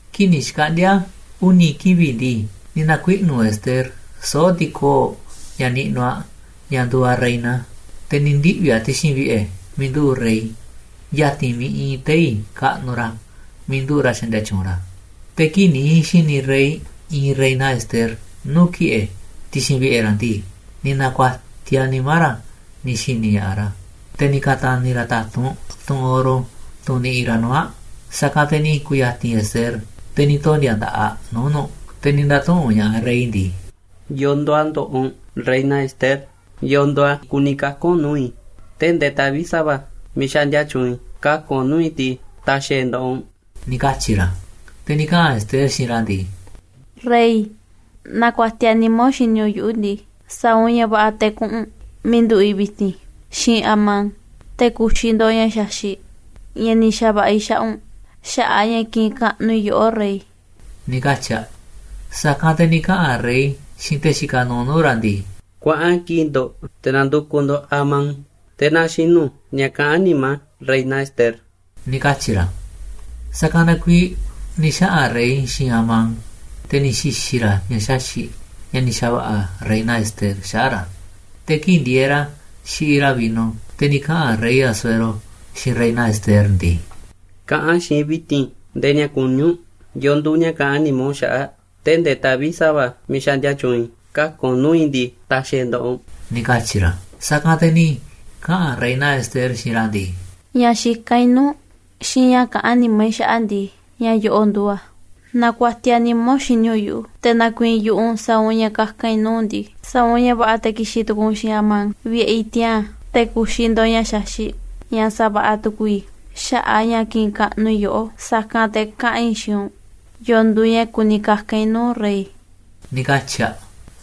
Kii̱ꞌ ni̱ xkaꞌndi̱a̱ uni̱ kivi̱ꞌ ndii, ni̱ na̱kuiꞌnu̱ Ester soo̱ꞌ ti̱koo̱ꞌ ña̱ niꞌnuꞌ aꞌ ña̱ nduuꞌ aꞌ reina, te̱ ni̱ ndiꞌvi̱ aꞌ ti̱xi̱n vi̱ꞌe̱ miiꞌ nduꞌu̱ꞌ rey, ya̱ti̱n miiꞌ iinꞌ tei̱ kaꞌnuꞌ ra̱ miiꞌ nduꞌu̱ꞌ ra̱ xaꞌndia tyuunꞌ ra̱. Te̱ kii̱ꞌ ni̱ xi̱ni̱ rey iinꞌ reina Ester nuu̱ꞌ ki̱ꞌe̱ ti̱xi̱n vi̱ꞌe̱ ra̱ ndii, ni̱ na̱ku̱a̱tiaꞌ nimá ra̱ ni̱ xi̱ni̱ ña̱ꞌaꞌ ra̱. Te̱ ni̱ ka̱ta̱ni̱ ra̱ ta̱tunꞌ tunꞌ oro, tunꞌ niꞌiꞌ ra̱ nuu̱ꞌ aꞌ. Sa̱kanꞌ te̱ ni̱ ku̱ya̱ti̱n Ester, te̱ ni̱ tondi̱a̱ nda̱ꞌaꞌ aꞌ nuu̱ꞌ nu̱ꞌ. Te̱ ni̱ nda̱tuꞌu̱nꞌ ña̱ꞌaꞌ rey ndii: ―¿Yo̱o̱ nduuꞌ a̱ ndoꞌoꞌ u̱nꞌ, reina Ester? ¿Yo̱o̱ nduuꞌ a̱ kuni kaka̱n u̱nꞌ nuu̱ꞌ i̱? Tee̱ꞌ ndee taꞌvi̱ꞌ sa̱va̱ miiꞌ xaꞌndia tyuunꞌ i̱ kaka̱n u̱nꞌ nuu̱ꞌ i̱ ndii, ta̱xi̱ i̱ e̱ nda̱ꞌaꞌ u̱nꞌ ―ni̱ katyi̱ ra̱. Te̱ ni̱ kaꞌa̱n Ester xiinꞌ ra̱ ndii: ―Rey, naaꞌ kuatiaꞌ nimá u̱nꞌ xini u̱nꞌ yuꞌu̱ ndii, sa̱a̱ u̱nꞌ ña̱ va̱ꞌa̱ te̱ kuꞌu̱n u̱nꞌ miiꞌ nduꞌu̱ꞌ i̱ vi̱ti̱n xiinꞌ Amán te̱ ku̱xi̱ ndo̱ꞌ ña̱ xaxi̱ꞌ ña̱ ni̱ xa̱va̱ꞌa̱ i̱ xaꞌa̱n u̱nꞌ xaꞌa̱ꞌ a̱ ña̱ kiꞌinꞌ kaꞌnuꞌ i̱ yoꞌó, rey ―ni̱ katyi̱ aꞌ. Sa̱kanꞌ te̱ ni̱ kaꞌa̱n rey xiinꞌ te̱ xikaꞌ nuuꞌ nuu̱ꞌ ra̱ ndii: ―Kuaꞌan kiꞌi̱ꞌ ndo̱ꞌ te̱ na̱ndu̱kuꞌ ndo̱ꞌ Amán, te̱ na xinu̱ ña̱ kaꞌán nimá reina Ester ―ni̱ katyi̱ ra̱. Sa̱kanꞌ na kuiiꞌ ni̱ xaꞌa̱n rey xiinꞌ Amán, te̱ ni̱ xi̱xi̱ ra̱ ña̱ xaxi̱ꞌ ña̱ ni̱ xa̱va̱ꞌa̱ reina Ester xaꞌa̱ꞌ ra̱. Te̱ kii̱ꞌ ndieeꞌ ra̱ xiꞌiꞌ ra̱ vino, te̱ ni̱ kaꞌa̱n rey Asuero xiinꞌ reina Ester ndii: ―Kaꞌa̱n xiinꞌ i̱ vi̱ti̱n nde̱e̱ ña̱ kuní u̱nꞌ. ¿Yo̱o̱ nduuꞌ ña̱ kaꞌán nimá u̱nꞌ xaꞌa̱ꞌ? Tee̱ꞌ ndee taꞌvi̱ꞌ sa̱va̱ miiꞌ xaꞌndia tyuunꞌ i̱ kaka̱n u̱nꞌ nuu̱ꞌ i̱ ndii, ta̱xi̱ i̱ e̱ nda̱ꞌaꞌ u̱nꞌ ―ni̱ katyi̱ ra̱. Sa̱kanꞌ te̱ ni̱ kaꞌa̱n reina Ester xiinꞌ ra̱ ndii: ―Ña̱ xikán i̱ nuu̱ꞌ u̱nꞌ xiinꞌ ña̱ kaꞌán nimá i̱ xaꞌa̱ꞌ ndii, ña̱ yo̱ꞌo̱ꞌ nduuꞌ a̱: Naaꞌ kuatiaꞌ nimá u̱nꞌ xini u̱nꞌ yuꞌu̱, te̱ na̱ku̱i̱i̱n yu̱ꞌuꞌ u̱nꞌ sa̱a̱ u̱nꞌ ña̱ kaka̱n i̱ nuu̱ꞌ u̱nꞌ ndii, sa̱a̱ u̱nꞌ ña̱ va̱ꞌa̱ te̱ ki̱xi̱n tu̱ku̱u̱ u̱nꞌ xiinꞌ Amán vi̱ꞌe̱ i̱ tiaa̱n, te̱ ku̱xi̱ ndo̱ꞌ ña̱ xaxi̱ꞌ ña̱ sa̱va̱ꞌa̱ tu̱ku̱u̱ i̱ xaꞌa̱ꞌ a̱ ña̱ kiꞌinꞌ kaꞌnuꞌ i̱ yoꞌó. Sa̱kanꞌ te̱ kaꞌa̱n i̱ xiinꞌ u̱nꞌ yo̱o̱ nduuꞌ ña̱ kuni kaka̱n i̱ nuu̱ꞌ u̱nꞌ, rey ―ni̱ katyi̱ aꞌ.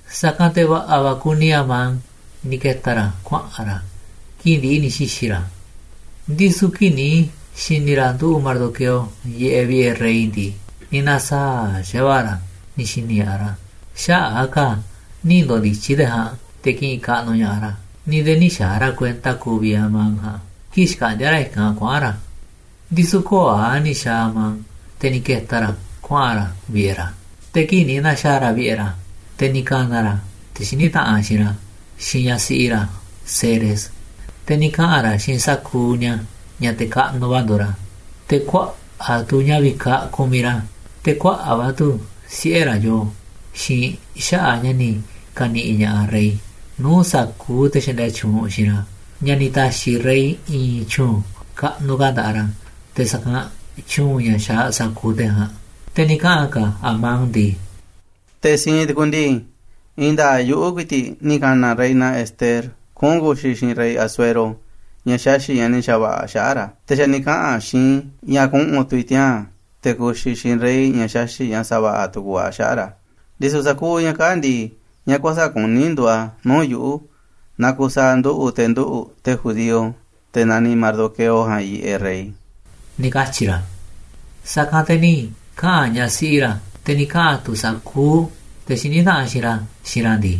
Sa̱kanꞌ te̱ va̱ꞌa̱ va̱ kuni Amán ni̱ ke̱ta̱ ra̱ kuaꞌa̱n ra̱ kii̱ꞌ ndi̱ꞌi̱ ni̱ xi̱xi̱ ra̱. Ndisu̱ kii̱ꞌ ni̱ xi̱ni̱ ra̱ nduꞌu̱ꞌ Mardoqueo yiꞌeꞌ vi̱ꞌe̱ rey ndii, ni̱ na̱saa̱ꞌ xa̱va̱ꞌa̱ ra̱ ni̱ xi̱ni̱ ña̱ꞌaꞌ ra̱ xaꞌa̱ꞌ a̱ ka̱ nï̱ ndo̱ndi̱tyi̱ te̱ ja̱a̱nꞌ te̱ ki̱ꞌi̱n kaꞌnuꞌ ña̱ꞌaꞌ ra̱, ni̱ nde̱e̱ nï̱ xa̱a̱ ra̱ kuenta kuuꞌ vi̱ꞌ Amán ja̱a̱nꞌ kii̱ꞌ xkaꞌndíá ra̱ i̱kanꞌ kuaꞌa̱n ra̱. Ndisu̱ köo̱ꞌ a̱ ni̱ xa̱a̱ Amán, te̱ ni̱ ke̱ta̱ ra̱ kuaꞌa̱n ra̱ vi̱ꞌe̱ ra̱. Te̱ kii̱ꞌ ni̱ na̱xa̱a̱ ra̱ vi̱ꞌe̱ ra̱, te̱ ni̱ ka̱na̱ ra̱ te̱ xiní taꞌanꞌ xiinꞌ ra̱, xiinꞌ ñaꞌ siꞌi ra̱ Zeres, te̱ ni̱ kaꞌa̱n ra̱ xiinꞌ sa̱kuuꞌ ni̱a̱ ña̱ te̱ kaꞌnuꞌ va̱ nduuꞌ ra̱, te̱ kuaꞌa̱ꞌ tu̱ ña̱ vikaꞌ kumiꞌ ra̱, te̱ kuaꞌa̱ꞌ va̱ tu̱ siꞌe̱ ra̱ yoo, xiinꞌ xaꞌa̱ꞌ ña̱ ni̱ ka̱ni̱ꞌi̱ ña̱ꞌaꞌ rey nuu̱ꞌ sa̱kuuꞌ te̱ xaꞌndia tyuunꞌ xiinꞌ ra̱, ña̱ ni̱ ta̱xi̱ rey i̱i̱n tyu̱u̱n kaꞌnuꞌ ka̱ nda̱ꞌaꞌ ra̱ te̱ sa̱kanꞌ tyu̱u̱n ña̱ xaaꞌ sa̱kuuꞌ te̱ ja̱a̱nꞌ. Te̱ ni̱ kaꞌa̱n ka̱ Amán ndii: ―Te̱ siinꞌ tu̱ku̱u̱ ndii, i̱i̱n nda̱a̱ꞌ yuꞌu̱ ku̱i̱ti̱ꞌ ni̱ ka̱na̱ reina Ester kuꞌu̱n ku̱xi̱ xiinꞌ rey Asuero ña̱ xaxi̱ꞌ ña̱ ni̱ xa̱va̱ꞌa̱ aꞌ xaꞌa̱ꞌ ra̱. Te̱ xa̱ ni̱ kaꞌa̱n aꞌ xiinꞌ i̱ ña̱ kuꞌu̱n tu̱ i̱ tiaa̱n te̱ ku̱xi̱ i̱ xiinꞌ rey ña̱ xaxi̱ꞌ ña̱ sa̱va̱ꞌa̱ tu̱ku̱u̱ aꞌ xaꞌa̱ꞌ ra̱. Ndisu̱ sa̱kuuꞌ ña̱ kaa̱ꞌ ndii, ña̱ kuäsa̱ꞌ kuní nduuꞌ a̱ nuu̱ꞌ yuꞌu̱ naaꞌ kusaaꞌ nduꞌu̱ꞌ te̱ nduꞌu̱ꞌ te̱ judío, te̱ naniꞌ Mardoqueo ja̱a̱nꞌ, yiꞌeꞌ rey ―ni̱ katyi̱ ra̱. Sa̱kanꞌ te̱ ni̱ kaꞌa̱n ñaꞌ siꞌi ra̱, te̱ ni̱ kaꞌa̱n tu̱ sa̱kuuꞌ te̱ xiní taꞌanꞌ xiinꞌ ra̱ xiinꞌ ra̱ ndii: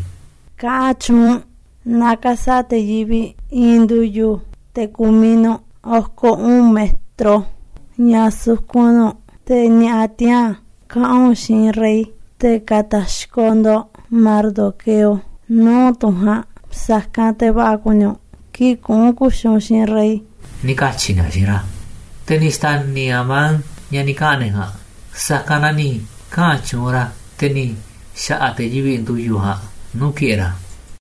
―Kaꞌa̱n tyuunꞌ u̱nꞌ na ka̱sa̱ꞌa̱ te̱ yivi̱ꞌ i̱i̱n ndu̱yu̱, te̱ ku̱miꞌ nu̱ꞌ oko̱ uꞌu̱n metro ña̱ sukun nu̱ꞌ, te̱ ni̱a̱ꞌa̱ tiaa̱n kaꞌa̱n u̱nꞌ xiinꞌ rey te̱ ka̱ta̱xkoꞌ ndo̱ꞌ Mardoqueo nuu̱ꞌ tunꞌ ja̱a̱nꞌ. Sa̱kanꞌ te̱ va̱ꞌa̱ kuni u̱nꞌ kii̱ꞌ kuꞌu̱n ku̱xi̱ u̱nꞌ xiinꞌ rey ―ni̱ katyi̱ ni̱a̱ xiinꞌ ra̱. Te̱ ni̱ xta̱ni̱ Amán ña̱ ni̱ kaꞌa̱n ne̱ ja̱a̱nꞌ, sa̱kanꞌ na ni̱ kaꞌa̱n tyuunꞌ ra̱, te̱ ni̱ xa̱ꞌa̱ te̱ yivi̱ꞌ ndu̱yu̱ ja̱a̱nꞌ nuu̱ꞌ ki̱ꞌe̱ ra̱.